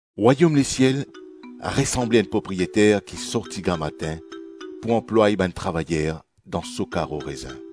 “Rwayom lesiel resanble enn propriyeter ki sorti gramatin pou anplway bann travayer dan so karo rezin.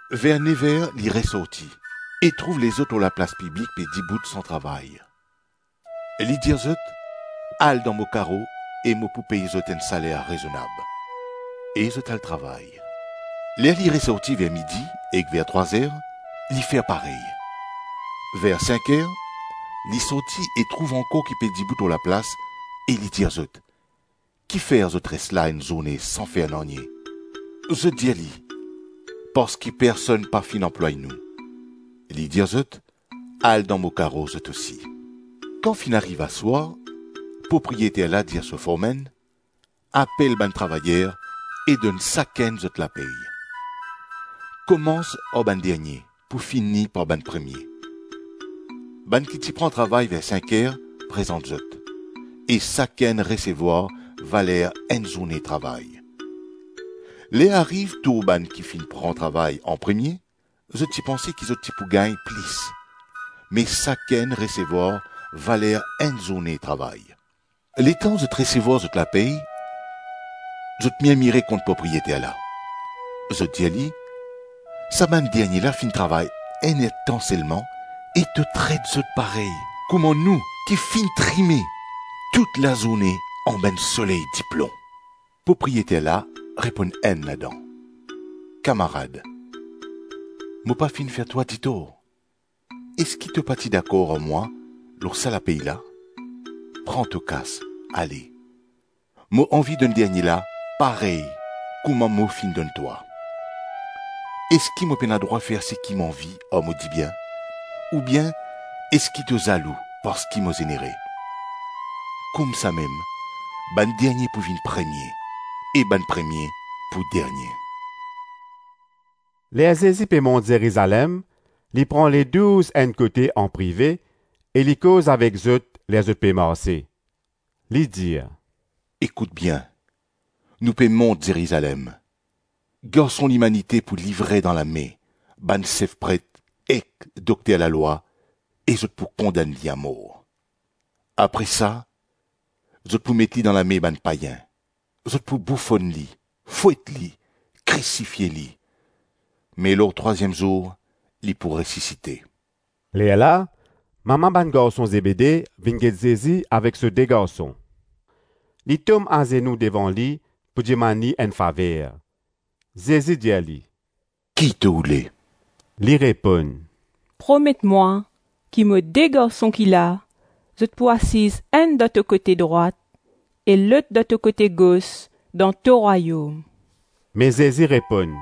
Ver nev-er li resorti, e trouv lezot lor laplas piblik pe dibout san travay. Li dir zot, ‘Al dan mo karo e mo pou pey zot enn saler rezonab.’ E zot al travay. Ler li resorti ver midi ek ver trwa-zer, li fer parey. Ver sink-er li sorti e trouv ankor ki pe dibout lor laplas; e li dir zot, ‘Kifer zot res la enn zourne san fer nanye?’ Zot dir li, ‘Parski personn pa finn anplway nou.’ Li dir zot, ‘Al dan mo karo zot osi.’ Kan finn ariv aswar, propriyeter la dir so formenn, ‘Apel bann travayer e donn sakenn zot lapey. Komans ar bann dernie pou fini par bann premie.’ Bann ki ti pran travay ver sink-er prezant zot, e sakenn resevwar valer enn zourne travay. Ler ariv tour bann ki finn pran travay anpremie, zot ti panse ki zot ti pou gagn plis; me sakenn resevwar valer enn zourne travay. Letan zot resevwar zot lapey zot mirmire kont propriyeter la. Zot dir li, ‘Sa bann dernie la finn travay enn-ertan selman, e to tret zot parey kouma nou ki finn trime tout lazourne anba enn soley diplon.’ Propriyeter la reponn enn ladan, ‘Kamarad, mo pa finn fer twa ditor. Eski to pa ti dakor ar mwa lor sa lapey la? Pran to kas, ale. Mo anvi donn dernie la parey kouma mo finn donn twa. Eski mo pena drwa fer seki mo anvi ar mo dibien? Oubien, eski to zalou parski mo zenere?’ Koumsamem, bann dernie pou vinn premie, e bann premie pou dernie.” Ler Zezi pe mont Zerizalem, li pran Ledouz enn kote anprive e li koz avek zot ler zot pe marse. Li dir, “Ekout bien, nou pe mont Zerizalem, Garson Limanite pou livre dan lame bann sef pret ek dokter lalwa e zot pou kondann li amor, apre sa zot pou met li dan lame bann payin, zot pou boufonn li, fwet li, krisifie li, me lor trwaziem zour li pou resisite.” Lerla mama bann garson Zebede vinn get Zezi avek so de garson, li tom azenou devan li pou dimann li enn faver. Zezi dir li, “Ki to oule?” Li reponn, “Promet mwa ki mo de garson ki la, zot pou asiz enn dan to kote drwat e lot dan to kote gos dan to Rwayom.” Me Zezi reponn,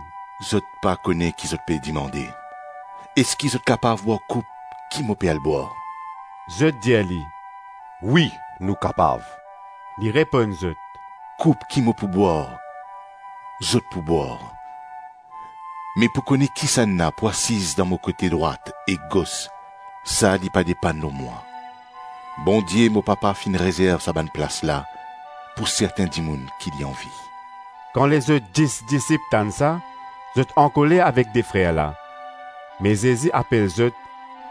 “Zot pa kone ki zot pe dimande. Eski zot kapav bwar koup ki mo pe al bwar?” Zot dir li, “Wi, nou kapav” Li reponn zot, “Koup ki mo pou bwar, zot pou bwar, me pou kone kisannla pou asiz dan mo kote drwat ek gos, sa li pa depann lor mwa. Bondie, mo papa finn rezerv sa bann plas la pou sertin dimoun ki li anvi.” Kan lezot dis disip tann sa, zot ankoler avek de frer la. Me Zezi apel zot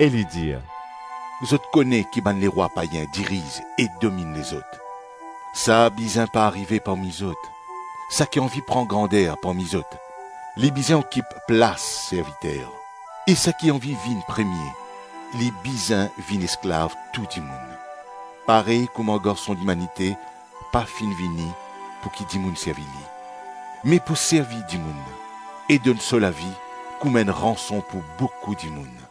e li dir, “Zot kone ki bann lerwa payin diriz e dominn lezot. Sa bizin pa arive parmi zot; saki anvi pran grander parmi zot, li bizin okip plas serviter, e saki anvi vinn premie, li bizin vinn esklav tou dimoun; parey kouma Garson Limanite pa finn vini pouki dimoun servi li, me pou servi dimoun e donn so lavi kouma enn ranson pou boukou dimoun.”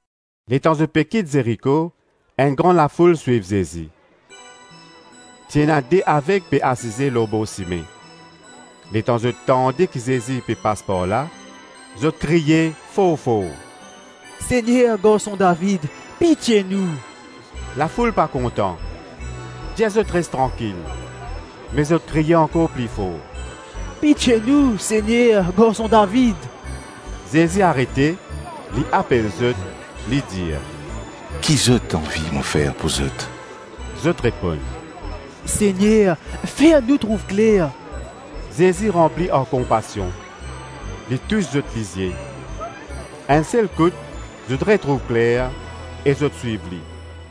Letan zot pe kit Zeriko, enn gran lafoul swiv Zezi. Ti ena de aveg pe asize lor bor sime. Letan zot tande ki Zezi pe pas par la, zot kriye for-for, “Segner, Garson David, pitie nou!” Lafoul pa kontan, dir zot res trankil; me zot kriye ankor pli for, “Pitie nou, Segner, Garson David!” Zezi arete, li apel zot, li dir, “Ki zot anvi mo fer pou zot?” Zot reponn, “Segner, fer nou trouv kler.” Zezi ranpli ar konpasion, li tous zot lizie. Enn sel kout, zot retrouv kler e zot swiv li.